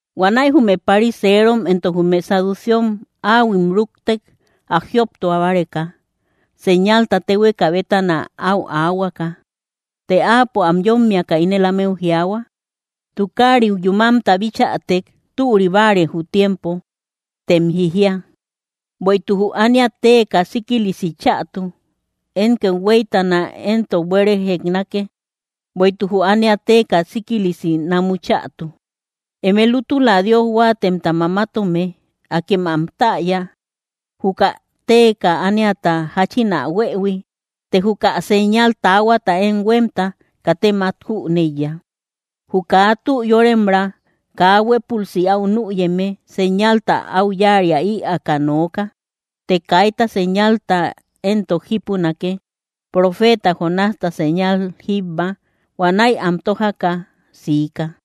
Huanäi jume pariserom entok jume saduceom áhuim rúktek, ä jioptua báreka, señalta téhueka bétana áu aahuaka. Të Áapo am yómmiaka ínel ámeu jiaahua: —Tukariu yúmamta bichätek: “Türi báare jü tiempo”, tem jijia: “Bueïtuk jü ánia téeka síkilisi chätu.” Én kethueytana éntok: “Buére jeknake, bueïtuk jü ánia téeka síkilisi namu chätu.” ¡Eme lútula Dios huáatemta mamatome! Akem ä täya, juka téeka ániata jáchin ä huëhui; të juka señal taahuata én huémta, ¡katem át jüneiya! Jü kaa tü yóremra kaa huépülsi au nüyeme, señalta áu yáaria ïaaka nooka; të kayta señalta éntok jípunake, profeeta Jonásta señal jíbba. Huanäi am tójaka siika.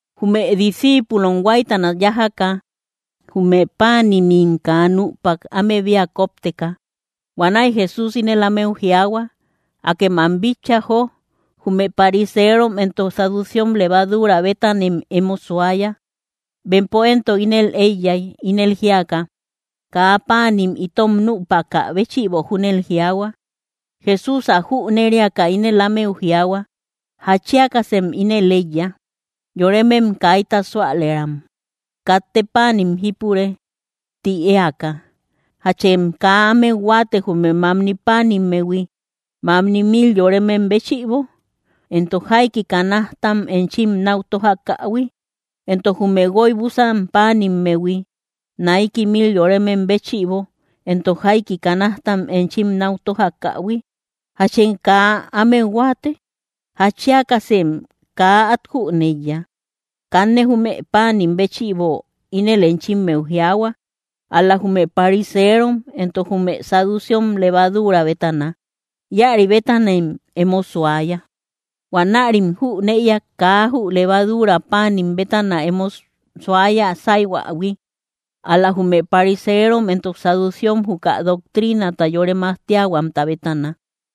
Jume discíipulom huáytana yájaka, jume páanimim kaa nüpak, ámebia kópteka. Huanäi Jesús ínel ámeu jiaahua: —¡Akem ä bitcha, jó! Jume pariserom entok saduceom levaduura bétanem emo suaya. Bempo éntok ínel éiyay, ínel jíaka: —Kaa páanim itom nüpakä béchïbo júnel jiaahua. Jesús ä jüneriaka, ínel ámeu jiaahua: —¿Jatchiakasem ínel éiya? ¡Yoremem kaita súalëram: “Katte páanim jipure”, ti éaka! ¿Jachem kaa ámeu huáate, jume mamni páanimmehui, mamni mil yoremem béchïbo, entok jaiki canajtam enchim náu tójakähui? Entok jume guoybusan páanimmehui, naiki mil yoremem béchïbo, entok jaiki canajtam enchim náu tójakähui, ¿jachem kaa ámeu huáate? ¿Jatchiakasem kaa át jüneiya? Kanne jume páanim béchïbo ínel enchimmeu jiaahua, ál‑la jume pariserom entok jume saduceom levaduura bétana; íäri bétanem emo suaya. Huanärim jünëiak, kaa jü levaduura páanim bétana emo suaya sáihuähui, ál‑la jume pariserom entok saduceom juka doctrinata yore majtiahuamta bétana.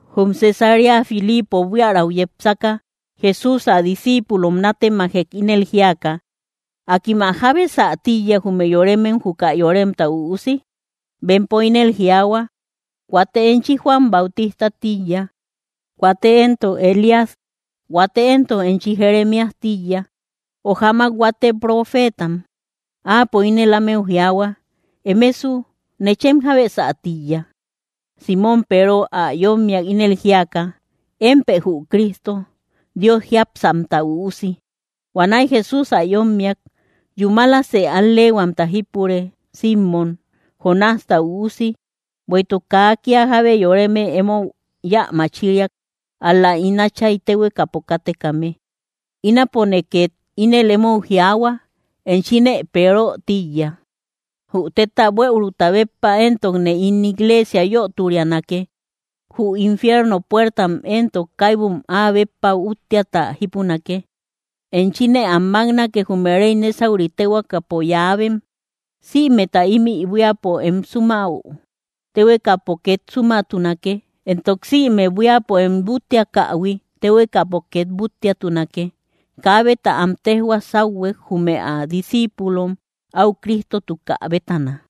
Jum Cesarea Filipo buiärau yepsaka, Jesús ä discíipulom nátemajek, ínel jíaka: —¿Akim ä jábesä tíiya, jume yoremem, juka Yoremta Üusi? Bempo ínel jiaahua: —Huate enchi Juan Bautistä tíiya; huate éntok Elías; huate éntok enchi Jeremías tíiya, ö jamak huate profeetam. Áapo ínel ámeu jiaahua: —Emesu, ¿nechem jábesä tíiya? Símon Peero ä yómmiak, ínel jíaka: —Émpë jü Cristo, Dios jiápsamta Üusi. Huanäi Jesús ä yómmiak: —Yúmalasë al‑leehuamta jípure, Simmom, Jonásta üusi, bueïtuk kaa kía jábe yoreme emou yä machiriak, ál‑la ín Áchay téhuekapo kátekame. Ínapone két ínel emou jiaahua, enchine Peero tíiya. Jü téta buëuruta béppa éntokne ín igleesia yöturianake; jü infierno puertam éntok kaibum áa béppa úttiata jípunake. Enchine am máknake, jume réy nésauri téhuekapo yáabem. Sïmeta ímï buíapo em súmäu, téhuekapo két súmatunake; entok sïme buíapo em búttiakähui, téhuekapo két búttiatunake. Kaabeta am téjhua sáuhuek, jume ä discíipulom, áu Cristotukä bétana.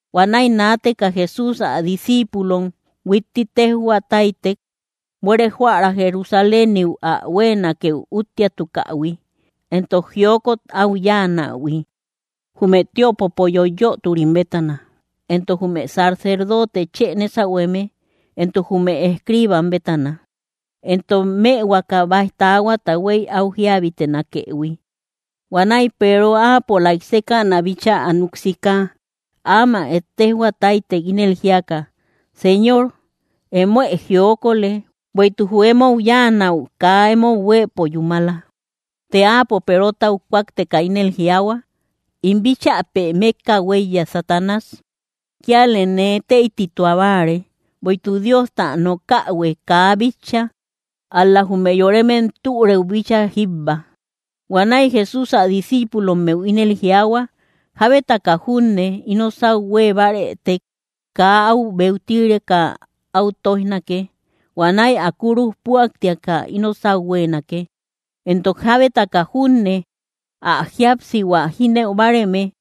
Huanäi naateka Jesús ä discíipulom huitti téjhua táytek, buere jóära Jerusaléniu ä huéenakeu úttiatukähui, entok jiokot áu yáanähui, jume tiöpopo yoiyöturim bétana, entok jume sacerdote chë nésahueme entok jume escriibam bétana, entok mëhuaka báij taahuata huéy áu jíabitenakëhui. Huanäi Peero áapolaik sékäna bíchaa ä nuk sika áamak ettejhua táytek, ínel jíaka: —¡Señor, emoë jiokolë; bueïtuk jü emou yáanäu kaa emou huéepo yúmala! Të Áapo Perotau kúakteka ínel jiaahua: —¡In bíchäpe mékka huéiye, Satanás! Kialë nee teïtituabáare, bueïtuk Diosta nokähuë kaa bitcha, ál‑la jume yoremem türëu bíchaa jíbba. Huanäi Jesús ä discíipulommeu ínel jiaahua: —Jábetaka junne ino sáu huée bárëtek, kaa áu beutireka áu tóijnake; huanäi ä kúruj püaktiaka ino sáu huéenake. Entok jábetaka junne ä jíapsihua jínëu báareme,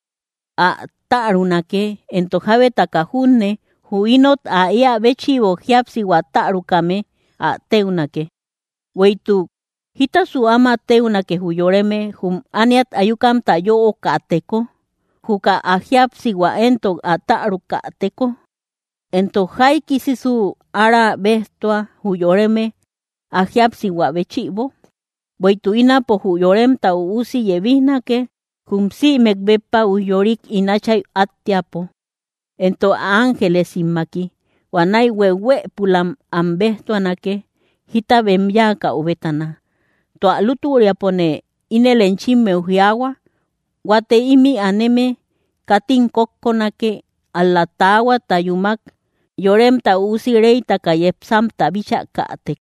ä tärunake; entok jábetaka junne jü inot ä éä béchïbo jíapsihua tärukame, ä téunake. Bueïtuk, ¿jítasu áma téunake jü yoreme, jum ániat ayukamta yöokateko, juka ä jíapsihua éntok ä tärukäteko? Entok, ¿jaikiksu ára béjtua jü yoreme, ä jíapsihua béchïbo? Bueïtuk ínapo jü Yoremta Üusi yebijnake, jum sïmek béppa ujyorik ín Áchay áttiäpo, entok ä ángelesimmaki. Huanäi hueuhuëpulam am béjtuanake, jita bem yáakau bétana. Tua lútüriapone ínel enchimmeu jiaahua, huate ímï aneme, katim kókkonake, ál‑la taahuata yúmak Yoremta Üusi réytaka yepsamta bíchakätek.